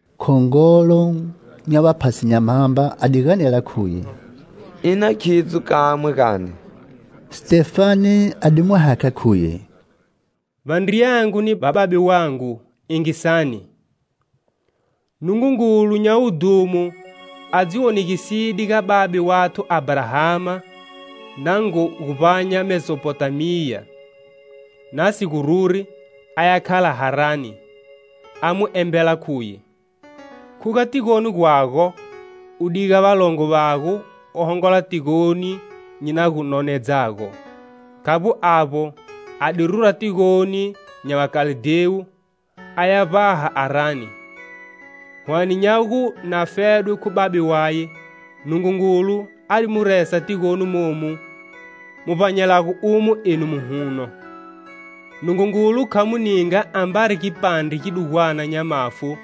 Khongolo nya vaphasi nya Mhamba a di ganela khuye: "Ina khidzo kamwe, gani?" Sitefane a di mu hakha khuye: "Vandriyangu ni vababe vangu, yingisani! Nungungulu nya wudhumo a dzi wonegiside ga babe wathu Abrahama na ngo gu vbanya Mesopotamiya, na si gu ruri aya khala Harani, a mu embela khuye: 'Khuga tigoni gwago u diga valongo vago u hongola tigoni nyi na gu nonedzago.' Khavbo avbo, a di rura tigoni nya Vakaldewu a ya vbaha Arani.Hwane nya gu na fedwe khu babe waye, Nungungulu a di mu resa tigoni momu mu vbanyelago umo enu muhuno. Nungungulu kha mu ninga ambari gipandre gidugwana nya mafu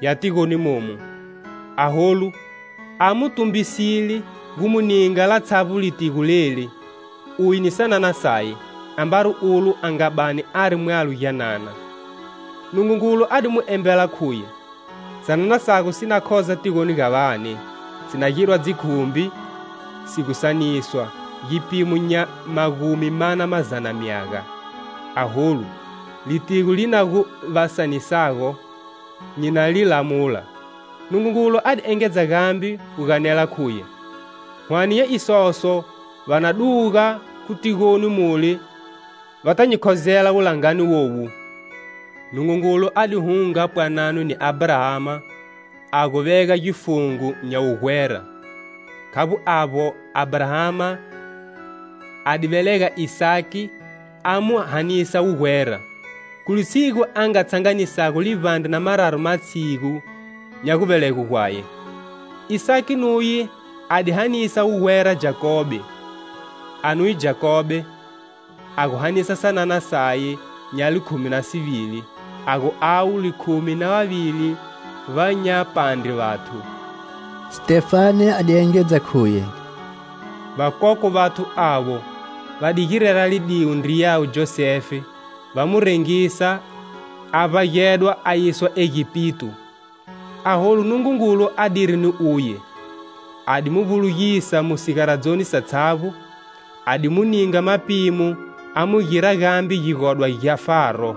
ya tigoni momu.Aholu a mu tumbisile gu mu ninga latshavbo litigo leli, uye ni sanana saye, ambari ulo a nga bani ari mwalo gyanana. Nungungulu a di mu embela khuye: 'Sanana sago si na khoza tigoni ga vane, si na girwa dzikhumbi si gu saniswa, gipimo nya magumi mana mazana myaga. Aholu, litigo li na gu va sanisago nyi na li lamula.' Nungungulu a di engedza gambe gu ganela khuye: 'Hwane nya isoso va na duga khu tigoni mule va ta nyi khozela wulangani wowu!' Nungungulu a di hunga pwanano ni Abrahama a gu vega gifungo nya wugwera. Khavbo avbo, Abrahama a di velega Isaki a mu hanisa wugwera, khu litshigu a nga tshanganisago livbandre na mararu matshigu nya guvelegwe gwaye. Isaki nuye a di hanisa wugwera Jakobe, a nuye Jakobe a gu hanisa sanana saye nya likhumi na sivili, a gu avo likhumi na vavili vanyapandre vathu." Sitefane a di engedza khuye: "Vakokwe vathu avo, va di girela lidiwo ndriyawe Josefe, va mu rengisa a vbagedwa a yiswa Egipito. Aholu Nungungulu adiri ni uye; a di mu vbulugisa mu sigaradzoni satshavbo; a di mu ninga mapimo a mu gira gambe gigodwa gya Faro,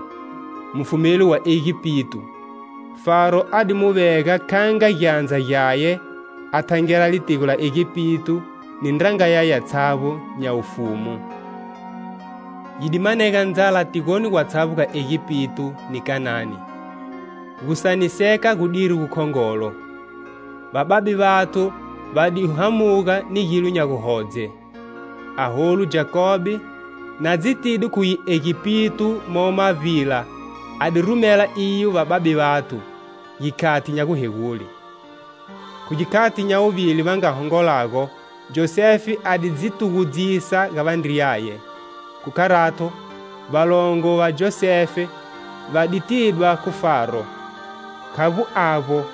mufumeli wa Egipito. Faro a di mu vega kha nga gyandza gyaye a thangela litigo la Egipito ni ndranga yaye yatshavbo nya wufumu. Yi di manega ndzala tigoni gwatshavbo ga Egipito ni Khanani. Gusaniseka gudiri gu khongolo. Vababe vathu va di hamuga ni gilo nya guhodze. Aholu, Jakobe, na dzitide khuye Egipito momo mavbila a di rumela iyo vababe vathu, gikhati nya guhegule. Khu gikhati nya wuvili va nga hongolago Josefe a di dzi tugudzisa ga vandriyaye. Khu Kharato, valongo va Josefe va di tidwa khu Faro. Khavbo avbo,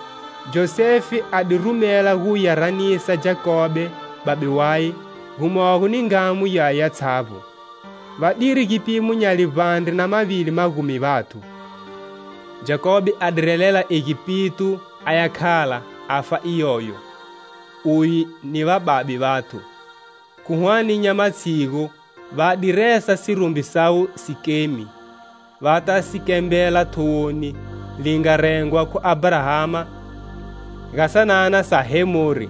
Josefe a di rumela gu ya ranisa Jakobe, babe waye, gumogo ni ngamu yaye yatshavbo. Va diri gipimo nya livbandre na mavili magumi vathu. Jakobe a di relela Egipito a ya khala, a fa iyoyo, uye ni vababe vathu. Khu hwane nya matshigu va di resa sirumbi sawe Sikemi, va ta si kembela thowoni li nga rengwa khu Abrahama ga sanana sa Hemori.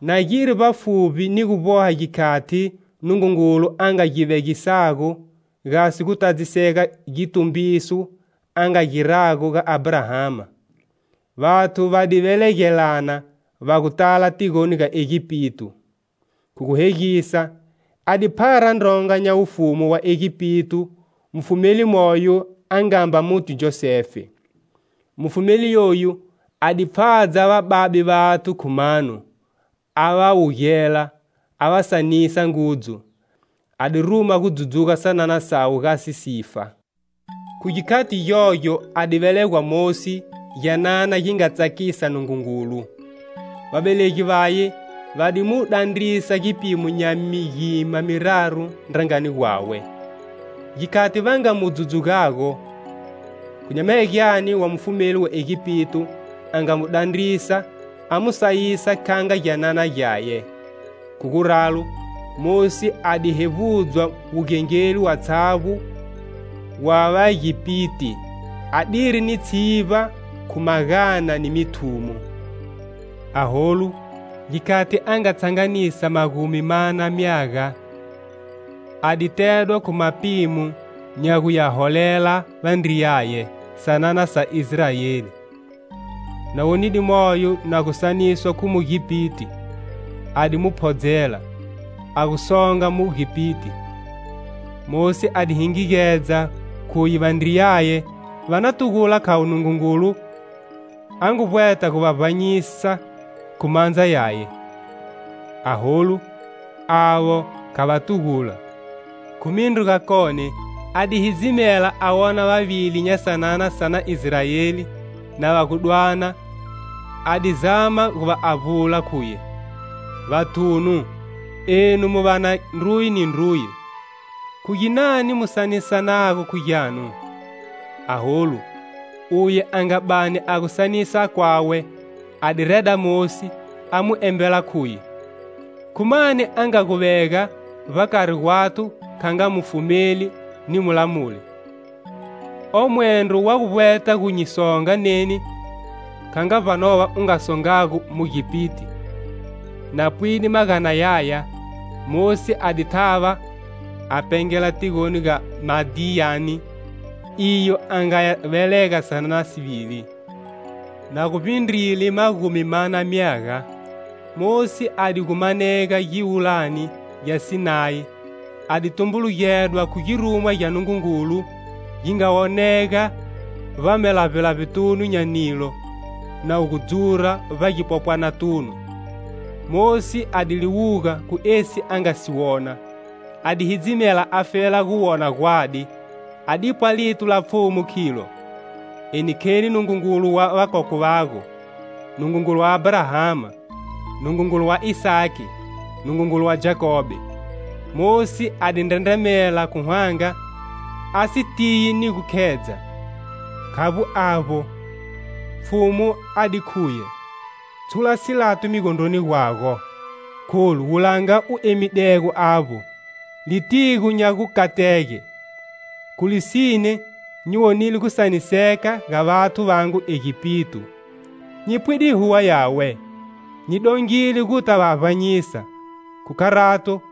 Na giri vbafuvbi ni gu vboha gikhati Nungungulu a nga gi vegisago gasi gu tadzisega gitumbiso a nga girago ga Abrahama, vathu va di velegelana va gu tala tigoni ga Egipito. Khu gu hegisa, a di phara ndronga nya wufumu wa Egipito, mufumeli moyo a nga mba muti Josefe. Mufumeli yoyu a di pfhadza vababe vathu khu mano, a va wugela, a va sanisa ngudzu; a di ruma gu dzudzuga sanana sawe gasi sifa. Khu gikhati gyogyo a di velegwa Mosi, gyanana gi nga tsakisa Nungungulu. Vavelegi vaye va di mu dandrisa gipimo nya migima miraru ndrangani gwawe. Gikhati va nga mu dzudzugago, khu nyamahegyane wa mufumeli wa Egipito a nga mu dandrisa a mu sayisa kha nga gyanana gyaye. Khu guralo, Mosi a di hevbudzwa wugengeli watshavbo wa vagipiti, a diri ni tshivba khu magana ni mithumo. Aholu, gikhati a nga tshanganisa magumi mana myaga a di tedwa khu mapimo nya gu ya holela vandriyaye, sanana sa Israeli. Na wonide moyo na gu saniswa khu Mugipiti, a di mu phodzela, a gu songa Mugipiti. Mosi a di hingigedza khuye vandriyaye va na tugula khavo Nungungulu a ngu vbweta gu va vbanyisa khu mandza yaye; aholu, avo kha va tugula. Khu mindru gakone a di hidzimela a wona vavili nya sanana sa na Israeli na va gu dwana, a di zama gu va avbula, khuye: 'Vathunu, enu mu va na ndruye ni ndruye! Khu ginani mu sanisanago khu gyanu?' Aholu, uye a nga bani a gu sanisa kwawe a di reda Mosi, a mu embela khuye: 'Khu mani a nga gu vega vbakari gwathu kha nga mufumeli ni mulamuli. O mwendro wa gu vbweta gu nyi songa neni kha nga vbanova u nga songago Mugipiti?' Na pwide magana yaya, Mosi a di thava a pengela tigoni ga Madiyani, iyo a nga ya velega sanana sivili. "Na guvbindrile magumi mana myaga, Mosi a di gu manega giwulani gya Sinayi, a di tumbulugedwa khu girumwa gya Nungungulu, gi nga wonega vbamalavbelavbetunu nya nilo na wu gu dzura vbagipopwanatunu. Mosi a di liwuga, khu esi a nga si wona. A di hidzimela afela gu wona gwadi, a dipwa lito la Pfhumu khilo: 'Eni kheni Nungungulu wa vakokwe vago, Nungungulu wa Abrahama, Nungungulu wa Isaki, Nungungulu wa Jakobe!' Mosi a di ndrendremela khu hwanga, a si tiyi ni gu khedza. Khavbo avbo, Pfhumu a di khuye: 'Tshula silato migondroni gwago, kholu, wulanga u emidego avbo, litigo nya gukatege. Khu lisine, nyi wonile gusaniseka ga vathu vangu Egipito; nyi pwide huwa yawe; nyi dongile gu ta va vbanyisa; Khu kharato,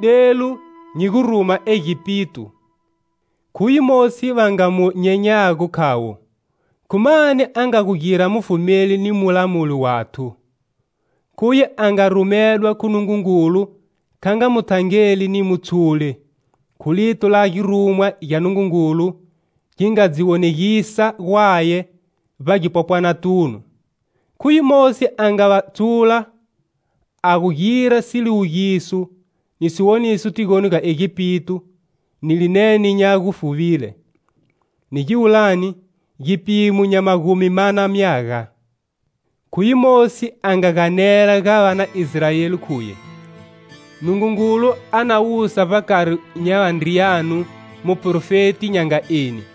delu, nyi guruma Egipito.' "Khuye Mosi va nga mu nyenyago khavo, khu mani a nga gu gira mufumeli ni mulamuli wathu. Khuye a nga rumedwa khu Nungungulu kha nga muthangeli ni mutshuli, khu lito la girumwa gya Nungungulu gi nga dzi wonegisa gwaye vbagipopwanatunu. Khuye Mosi a nga va tshula a gu gira siliwugiso ni siwoniso tigoni ga Egipito ni linene nya gufuvile, ni giwulani, gipimo nya magumi mana myaga. Khuye Mosi a nga ganela ga va na Israeli khuye: 'Nungungulu a na wusa vbakari nya vandriyanu muprofeti nya nga eni.'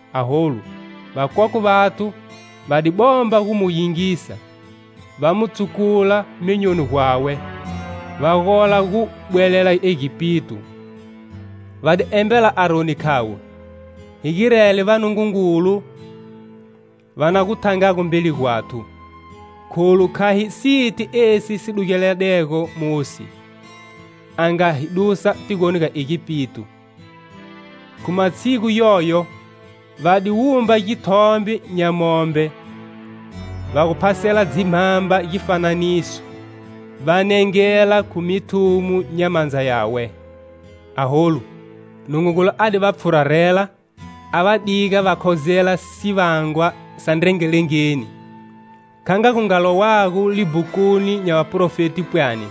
Aholu, vakokwe vathu va di bomba gu mu yingisa, va mu tsukula myonyoni gwawe, va gola gu bwelela Egipito. Va di embela Aroni khavo: 'Hi girele vanungungulu va na gu thangago mbeli gwathu; kholu kha hi siti esi si dugeledego Mosi, a nga hi dusa tigoni ga Egipito.' Khu matshigu yoyo va di wumba githombe nya mombe va gu phasela dzimhamba gifananiso, va nengela khu mithumo nya mandza yawe. Aholu, Nungungulu a di va pfhurarela a va diga va khozela sivangwa sa ndrengelengeni, kha nga gu nga lowago libhukuni nya vaprofeti pwani: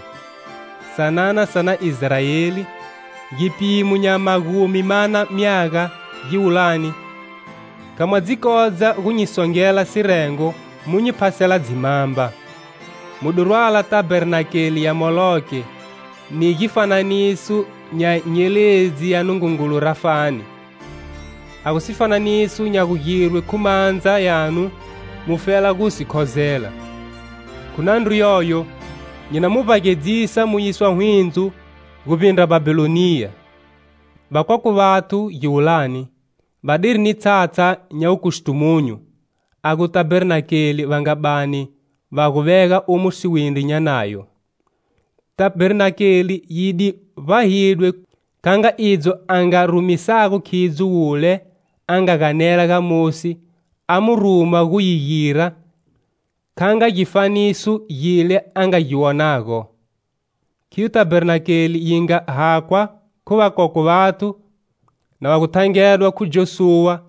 'Sanana sa na Israeli,gipimo nya magumi mana myaga giwulani kha mwa dzi kodza gu nyi songela sirengo mu nyi phasela dzimhamba, Mu di rwala tabernakele ya Moloke, ni gifananiso nya nyeledzi ya nungungulu Rafani,a gu sifananiso nya gugirwe khu mandza yanu mufela gu si khozela.Khu nandru yoyo, nyi na mi vbagedzisa mu yiswa hwindzo guvbindra Bhabhiloniya.' "Vakokwe vathu, giwulani, vadiri ni tshatsha nya wukustumunyu, a gu Tabernakele va nga bani va gu vega umo siwindri nya Nayo. Tabernakele yi di vbahidwe kha nga idzo a nga rumisago khidzo Wule a nga ganela ga Mosi a mu ruma gu yi gira kha nga gifaniso gile a nga gi wonago. Khiyo Tabernakele yi nga hakhwa khu vakokwe vathu na va gu thangedwa khu Josuwa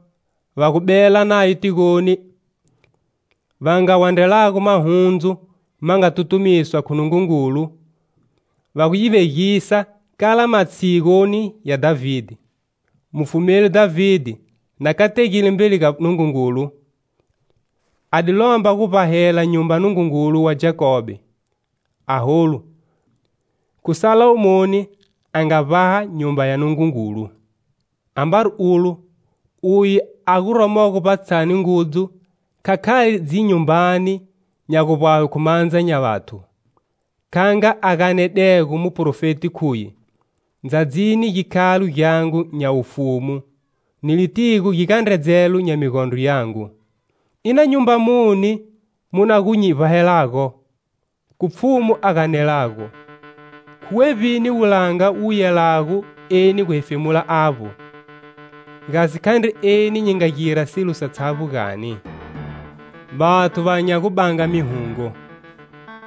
va gu bela nayo tigoni va nga wandrelago mahundzu ma nga tutumiswa khu Nungungulu, va gu yi vegisa kala matshiguni ya Dhavide. Mufumeli Dhavide, na kategile mbeli ga Nungungulu, a di lomba guvbahela nyumba Nungungulu wa Jakobe. Aholu, khu Salomoni a nga vbaha Nyumba ya Nungungulu. Ambari ulo, uye a guromo vbatshani ngudzu kha khali dzinyumbani nya gu vbahwe khu mandza nya vathu, kha nga a ganedego muprofeti khuye: 'Ndzadzini gikhalo gyangu nya wufumu ni litigo gigandredzelo nya migondro yangu,ina nyumba muni mu na gu nyi vbahelago?Khu Pfhumu a ganelago;khu wevbini wulanga wu yelago eni guhefemula avbo? Gasi khandri eni nyi nga gira silo satshavbo, gani?' Vathu va nya gu banga mihungo,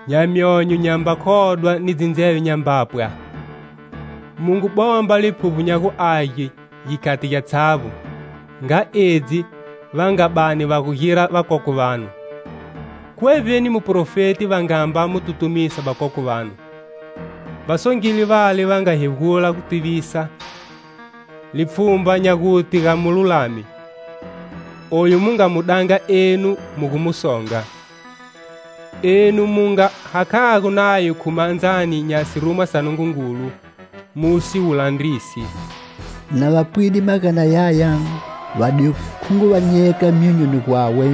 nya myonyo nyamba khodwa ni dzindzeve nyamba pwa. Mu ngu bomba Liphuvbo nya gu Age gikhati gyatshavbo, nga edzi va nga bani va gu gira vakokwe vanu. Khu wevbini muprofeti va nga mba mu tutumisa vakokwe vanu? Va songile vale va nga hegula gutivisa lipfhumba nya gute ga Mululami, oyu mu nga mu danga enu mu gu mu songa. Enu mu nga hakhago Nayo khu mandzani nya sirumwa sa Nungungulu mu si wu landrisi." Na va pwide magana yaya va di khunguvanyega myonyoni gwawe,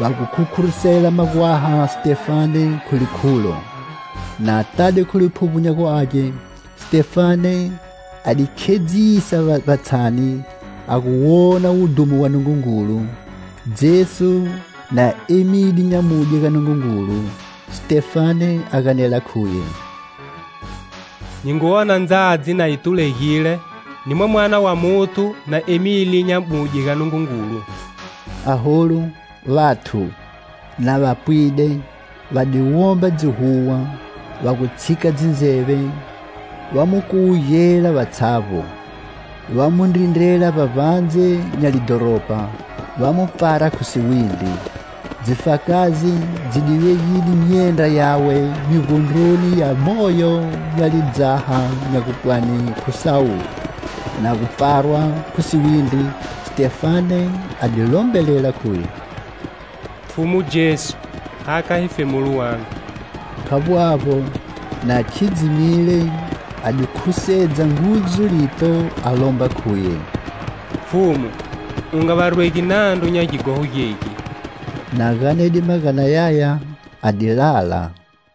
va gu khukhurusela magwaha Sitefane khu likhulo. Na tade khu Liphuvbo nya gu Age, Sitefane a di khedzisa vbatshani a gu wona wudhumo wa Nungungulu, Jesu na emile nyamudye ga Nungungulu, Sitefane a ganela khuye: "Nyi ngu wona ndzadzi na yi tulegile ni Mwamana wa Muthu na emile nyamudye ga Nungungulu." Aholu, vathu, na va pwide, va di womba dzihuwa, va gu tshika dzindzeve, va mu kuwugela vatshavbo, va mu ndrindrela vbavbandze nya lidhoropa, va mu pfara khu siwindri. Dzifakazi dzi di vegile myendra yawe migondroni ya moyo nya lidzaha nya gupwani khu Sawulo. Na gu pfarwa khu siwindri Sitefane a di lombelela khuye: "Pfhumu Jesu hakha hefemulo wangu!" Khavbo avbo, na khidzimile a di khusedza ngudzu lito a lomba khuye: "Pfhumu, U nga va rwegi nandru nya gighoho gegi." Na ganede magana yaya a di lala.